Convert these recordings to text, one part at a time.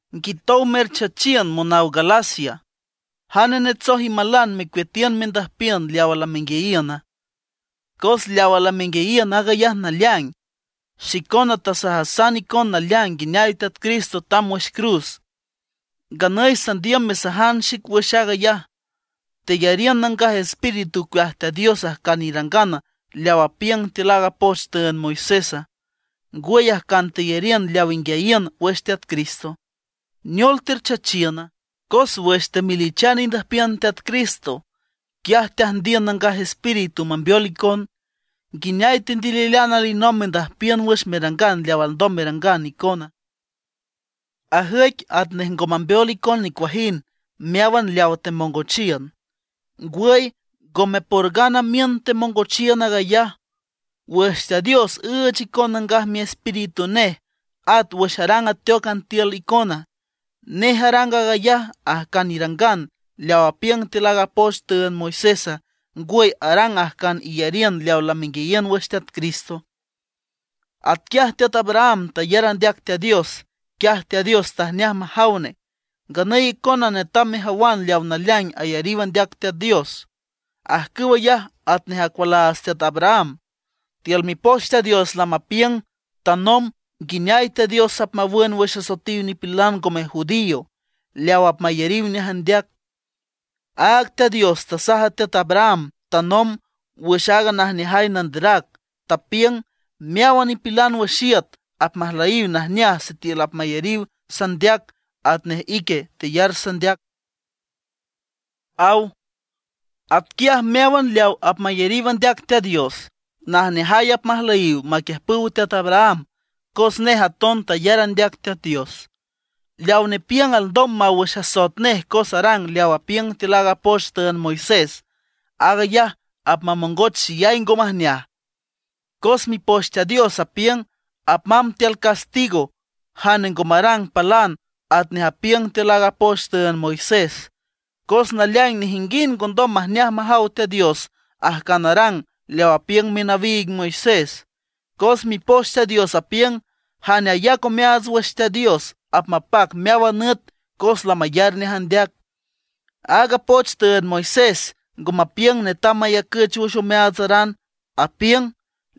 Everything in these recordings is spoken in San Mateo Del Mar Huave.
¡Nguitow merchachiün monaw Galacia! ¿Jane netsoj imalan mecueatiün mendüjpiün leawa lamenguiayiüna? Cos leawa lamenguiayiün aag ayaj naleaing. Xicona tasajasan icon naleaing nguineay Teat Jesucristo tamb wüx cruz. Nganüy sandiüm mesajan xic wüx aag ayaj. ¿Teyariün Nangaj Espíritu ocueaj Teat Dios ajcan irangan leaw apiüng tiül aaga poch tüünd Moisésa? ¿Ngwüy, ajcan teyariün leaw inguiayiün wüx Teat Cristo? ¿Neol terchachiüna? Cos wüx temelichan indüjpiün Teat Cristo, quiaj teajndiün Nangaj Espíritu mambeol icon. ¿Nguineay tendililean alinomb mendüyiün wüx merangan leaw alndom merangan icona? Ajüic atnej ngo mambeol icon nicuajind meáwan leawa temongochiün. ¡Ngwüy, ngome por ngana miün temongochiün aag ayaj! Wüx Teat Dios üüch icon Nangaj Miespíritu nej, at wüx arang ateócan tiül icona, ¿nej arang aag ayaj ajcan irangan leaw apiüng tiül aaga poch tüünd Moisésa, ngwüy arang ajcan iyariün leawa lamenguiayiün wüx Teat Cristo? Atquiaj teat Abraham tayar andeac Teat Dios, quiaj Teat Dios tajneaj majaw nej. Nganüy icona netam mejawan leaw naleaing ayariw andeac Teat Dios, ajcüw ayaj atnej acualaats teat Abraham. Tiül Mipoch Teat Dios lamapiüng tanomb nguineay Teat Dios apmawün wüx asoetiw nipilan ngome judío leaw apmayariw nej andeac. Áag Teat Dios tasaj a teat Abraham tanomb wüx aaga najneajay nanderac, tapiüng: “Meáwan nipilan wüx iüt apmajlüyiw najneaj sitiül apmayariw sandeac atnej ique teyar sandeac”, aw. Atquiaj meáwan leaw apmayariw andeac Teat Dios, najneajay apmajlüyiw maquiüjpüw teat Abraham cos nej aton tayar andeac Teat Dios. Leaw nepiüng alndom maw wüx asoet nej cos arang leaw apiüng tiül aaga poch tüünd Moisés, aag ayaj apmamongoch xeyay ngo majneaj. Cos Mipoch Teat Dios apiüng: “Apmamb tiül castigo jane ngo marang palan atnej apiüng tiül aaga poch tüünd Moisés”. Cos naleaing nejinguind ngondom majneaj majaw Teat Dios ajcan arang leaw apiüng minawiig Moisés, cos Mipoch Teat Dios apiüng: “Jane ayac omeaats wüx Teat Dios apmapac meáwan nüt cos lamayar nej andeac”. Aaga poch tüünd Moisés ngo mapiüng netam mayacüch wüx omeaatsaran. Apiüng: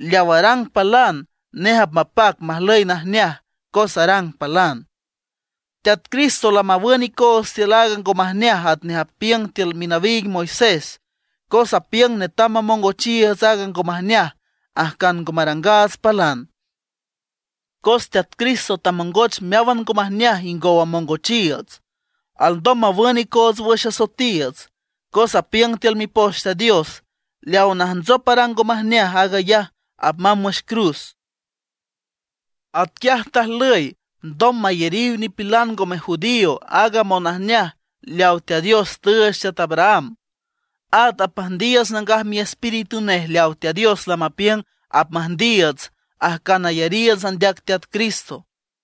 “Leaw arang palan, nej apmapac majlüy najneaj cos arang palan”. Teat Cristo lamawün icoots tiül aaga ngo majneaj atnej apiüng tiül minawiig Moisés, cos apiüng netam mamongochiiüts aaga ngo majneaj ajcan ngo marangaats palan. Cos Teat Cristo tamongoch meáwan ngo majneaj ingow amongochiiüts, alndom mawün icoots wüx asoetiiüts. Cos apiüng tiül Mipoch Teat Dios: “Leaw najntsop arang ngo majneaj aag ayaj apmamb wüx cruz”. Atquiaj tajlüy alndom mayariw nipilan ngome judío aaga monajneaj leawa Teat Dios tüüch teat Abraham. At apmüjndiiüts Nangaj Miespíritu nej leaw Teat Dios lamapiüng apmüjndiiüts ajcan ayariiüts andeac Teat Cristo.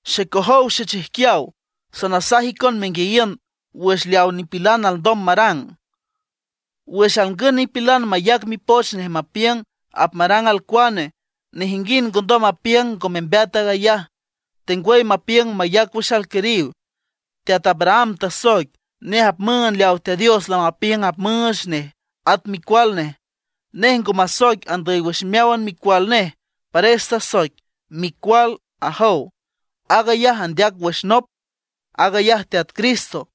Xecojow xechijquiaw, sanasaj icon menguiayiün wüx leaw nipilan alndom marang. Wüx alngün nipilan mayac mipoch nej mapiüng apmarang alcuane, nejinguind ngondom mapiüng ngo membeat aag ayaj, tengwüy mapiüng mayac wüx alquiriw. Teat Abraham tasoic, nej apmüünd leaw Teat Dios lamapiüng apmüüch nej at micual nej. Nej ngo masoic andüy wüx meáwan micual nej, pares tasoic: “Micual”, ajow. Aag ayaj andeac wüx nop, aag ayaj Teat Cristo.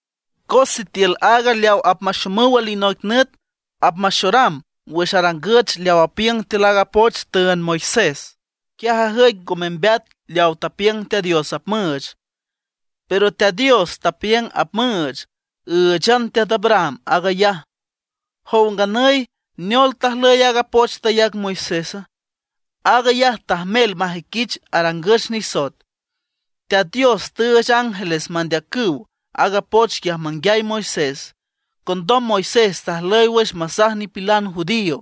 Cos sitiül aaga leaw apmaxomüw alinoic nüt apmaxoram wüx arangüch leaw apiüng tiül aaga poch tüünd Moisés, quiaj ajüic ngo membeat leaw tapiüng Teat Dios apmüüch. Pero Teat Dios tapiüng apmüüch, ǘüchan teat Abraham aag ayaj. Jow nganüy, ¿neol tajlüy aaga poch tayac Moisésa? Aag ayaj tajmel majüiquich arangüch nisoet. Teat Dios tüüch ángeles mandeacüw aaga poch quiaj manguiay Moisés, condom Moisés tajlüy wüx masaj nipilan judío.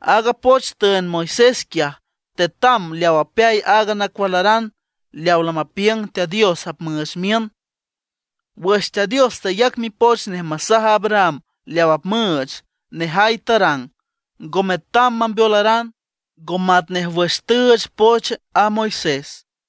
Aaga poch tüünd Moisés quiaj tetam leaw apeay aaga nacualaran leaw lamapiüng Teat Dios apmüüch miün. Wüx Teat Dios tayac mipoch nej masaj a Abraham leaw apmüüch, nejay tarang, ngo metam mambeolaran, ngo matnej wüx tüüch poch a Moisés.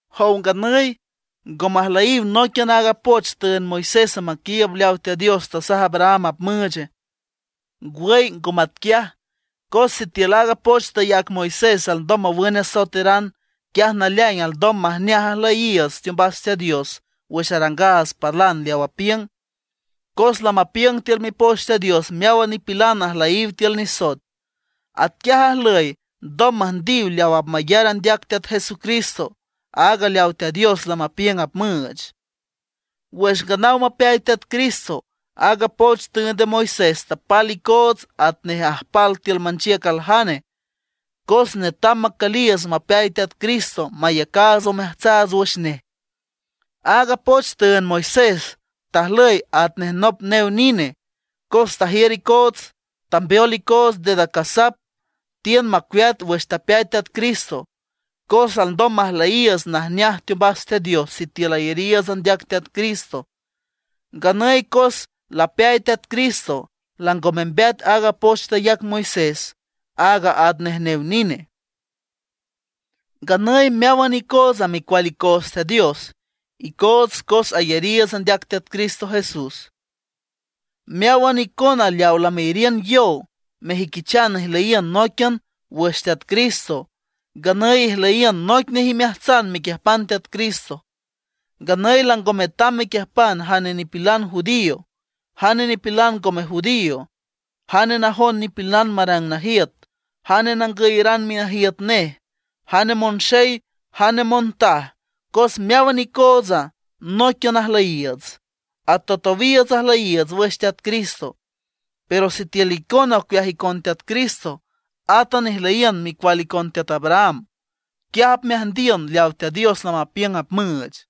¿Jow nganüy ngo majlüyiw nóiquian aaga poch tüünd Moisésa maquiiüb leaw Teat Dios tasaj a Abraham apmüüche? Ngwüy ngo matquiaj, cos sitiül aaga poch tayac Moisés alndom mawün asoeteran, quiaj naleaing alndom majneaj ajlüyiiüts teombas Teat Dios wüx arangaats palan leaw apiüng. Cos lamapiüng tiül Mipoch Teat Dios meáwan nipilan ajlüyiw tiül nisoet. Atquiaj ajlüy alndom müjndiw leaw apmayar andeac Teat Jesucristo aaga leaw Teat Dios lamapiüng apmüüch. Wüx nganaw mapeay Teat Cristo, aaga poch tüünd a Moisés tapal icoots atnej ajpal tiül manchiüc aljane, cos netam macüliiüts mapeay Teat Cristo mayacaats omeajtsaats wüx nej. Aaga poch tüünd Moisés tajlüy atnej nop new nine. Cos tajiür icoots, tambeol icoots dedacasap; tiün macueat wüx tapeay Teat Cristo, cos alndom majlüyiiüts najneaj teombas Teat Dios sitiül ayariiüts andeac Teat Cristo. Nganüy cos lapeay Teat Cristo, lango membeat aaga poch tayac Moisés, aaga atnej new nine. Nganüy meáwan icootsa micual icoots Teat Dios icoots cos ayariiüts andeac Teat Cristo Jesús. Meáwan icona leaw lameyariün yow mejüiquichan ijlüyiün nóiquian wüx Teat Cristo, nganüy ijlüyiün noic nej imeajtsan mequiüjpan Teat Cristo. Nganüy lango metam mepiüngan jane nipilan judío, jane nipilan ngome judío, jane najon nipilan marang najiüt, jane nangüyeran minajiüt nej, jane monxey, jane montaj; cos meáwan icootsa nóiquian ajlüyiiüts, atowtowiiüts ajlüyiiüts wüx Teat Cristo. Pero sitiül icona ocueaj icon Teat Cristo, átan ijlüyiün micual icon teat Abraham, quiaj apmeajndiün leaw Teat Dios lamapiüng apmüüch.